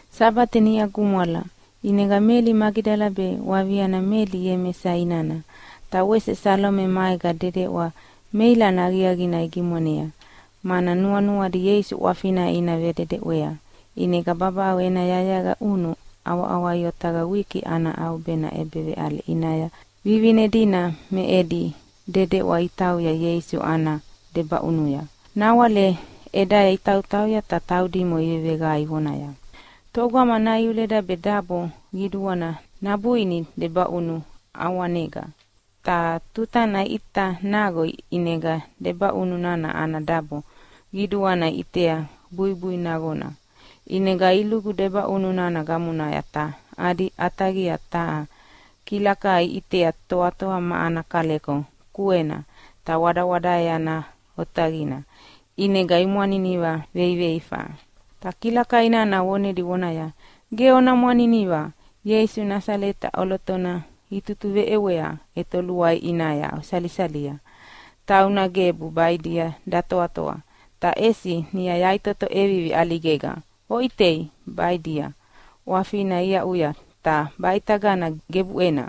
Sabate niʼa gumwala, ʼinega Meli Magidala be waviana Meli Iemesa inana, ta wese Salome maega dedeʼwa meilana aqiaqina igimwanea, mana nuanuadi Ieisu ʼwafina ina vededeʼwea. ʼInega babaʼau ena yayaqa ʼunu ʼawaʼawai otaqaya wiki ana ʼaubena ʼebeveʼale ʼinaya vivine dina me edi dedeʼwa itauya Ieisu ana debaʼunuya. Nawale ʼedaya itautauya ta taudimo iveveqae ivonaya, “Togama naiuleda be dabo qiduana nabuini debaʼunu ʼawanega?” Ta tutana iʼita naqo ʼinega debaʼunu nana ana dabo qiduana iʼitea buibui naqona. ʼInega ilugu debaʼunu nana gamonaya ta adi ʼataqia taha kilakai iʼitea toatoa ma ana kaleko kuena ta wadawadaea otaqina, ʼinega imwaniniva veiveifa. Ta kilakai nana vonedi vonaya, “Ge ona mwaniniva! Ieisu Nasaleta ʼolotona itutuveʼewea ʼetoluai ʼinaya osalisalia. Tauna gebu baʼidia datoatoa, ta ʼesi niʼa yaʼitoto ʼevivi ʼaligega. Oʼitei, baʼidia ʼwafina iaʼuya, ta baʼitagana gebuʼena.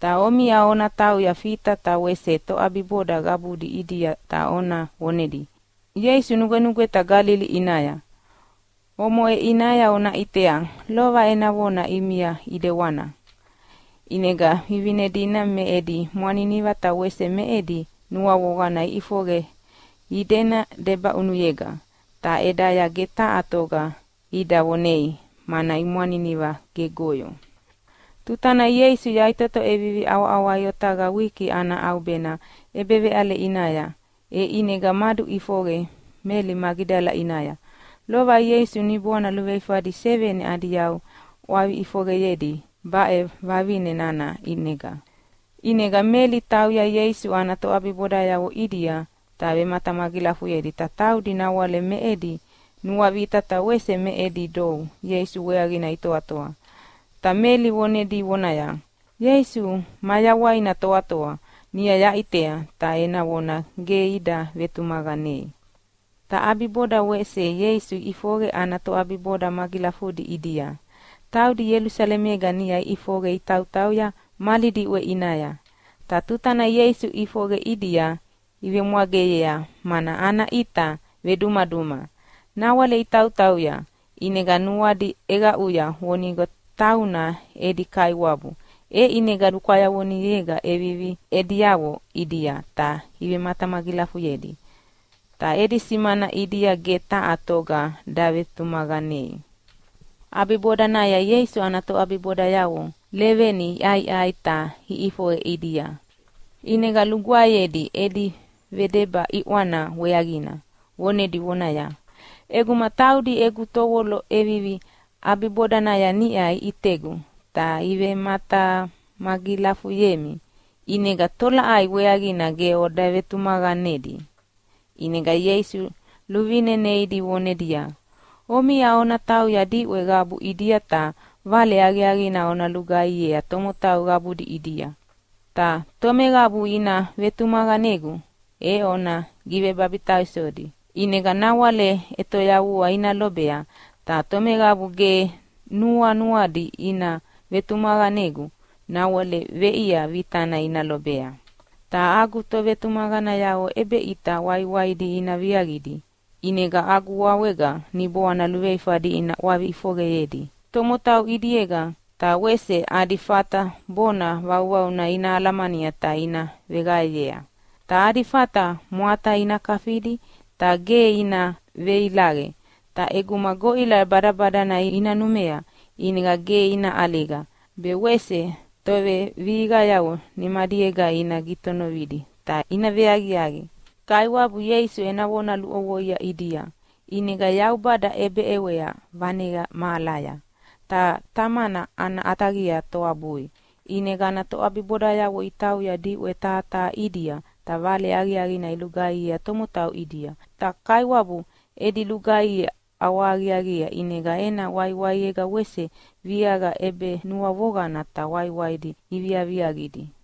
Ta omiʼa ona tauya Fita ta wese toʼabiboda qabudi ʼidia ta ona vonedia, ‘Ieisu nugwenugweta Galili ʼinaya, omoʼe ʼinaya ona ʼitea, lova ena vona ʼimia ʼidewana.’” ʼInega vivine dina me edi mwaniniva ta wese me edi nuavoqana iʼifoqe idena debaʼunuyega. Ta ʼedaya ge taha toga ida vonei, mana imwaniniva gegoyo. [Tuta nana Ieisu yaʼitoto ʼevivi ʼawaʼawai otaqaya wiki ana ʼaubena ʼebeveʼale ʼinaya, e ʼinega maduʼifoqe Meli Magidala ʼinaya. Lova Ieisu niboana luveifadi seveni adi yau ʼwavi ʼifoqeyedi baʼe vavine nana ʼinega. ʼInega Meli tauya Ieisu ana toʼabibodayavo ʼidia ta vematamagilafuyedi. Ta taudi nawale me edi nuavita ta wese me edi dou Ieisu weaqina itoatoa. Ta Meli vonedi vonaya, “Ieisu mayawaina toatoa, niʼa yaʼitea!” Ta ena vona ge ida vetumaqanei. Ta ʼabiboda wese Ieisu ʼifoqe ana toʼabiboda magilafudi ʼidia. Taudi Ielusalemega niʼa iʼifoqe itautauya mali diʼwe ʼinaya. Ta tutana Ieisu ʼifoqe ʼidia ivemwageyea mana ana ʼita vedumaduma. Nawale itautauya, ʼinega nuadi ʼeqaʼuya vonigo tauna edi Kaiwabu, e ʼinega lukwayavonega iʼevivi ediavo ʼidia ta ivematamagilafuyedi. Ta edi simana ʼidia ge taha toga davetumaqanei. ʼAbibodanaya Ieisu ana toʼabibodayavo leveni iʼaiʼai ta ʼifoqe ʼidia. ʼInega lugwaeyedi edi vedeba ʼiʼwana weaqina, vonedi vonaya, “ʼEguma taudi egu tovolo ʼevivi ʼabibodanaya niʼa iʼitegu ta ivematamagilafuyemi, ʼinega tolaʼai weaqina ge oda vetumaqanedi?” ʼInega Ieisu luvine neidi vonedia, “Omiʼa ona tauya diʼwe qabuna ʼidia ta Vale Aqiaqina ona lugaihiea tomotau qabudi ʼidia. Ta tomeqabu ina vetumaqanegu e ona givebabitaisodi, ʼinega nawale ʼetoyavua ina lobea. Ta tomeqabu ge nuanuadi ina vetumaqanegu nawale veʼia vitana ina lobea. “Ta agu tovetumaqanayavo ʼebeʼita waiwaidi ina viaqidi. ʼInega agu wawega niboana luveifadi ina ʼwavi ʼifoqeyedi tomotau ʼidiega, ta wese adi fata bona vauvauna ina alamania ta ina veqaeyea. Ta adi fata mwata ina kafidi ta ge ina veilaqe, ta ʼeguma goʼila badabadana ina numea ʼinega ge ina ʼaliga. Be wese tovevihiqayavo nimadiega ina gitonovidi ta ina veaqiaqi.” Kaiwabu Ieisu ena vona luʼovoia ʼidia, ʼinega Yaubada ʼebeʼewea vaneqa mahalaya, ta Tamana ana ʼataqia toabui. ʼInega ana toʼabibodayavo itauya diʼwe taha taha ʼidia ta Vale Aqiaqina ilugaihiea tomotau ʼidia. Ta Kaiwabu edi lugaihi ʼawahaqiaqiea ʼinega ena waiwaiega wese viaqa ʼebenuavoqana ta waiwaidi iviaviaqidi.]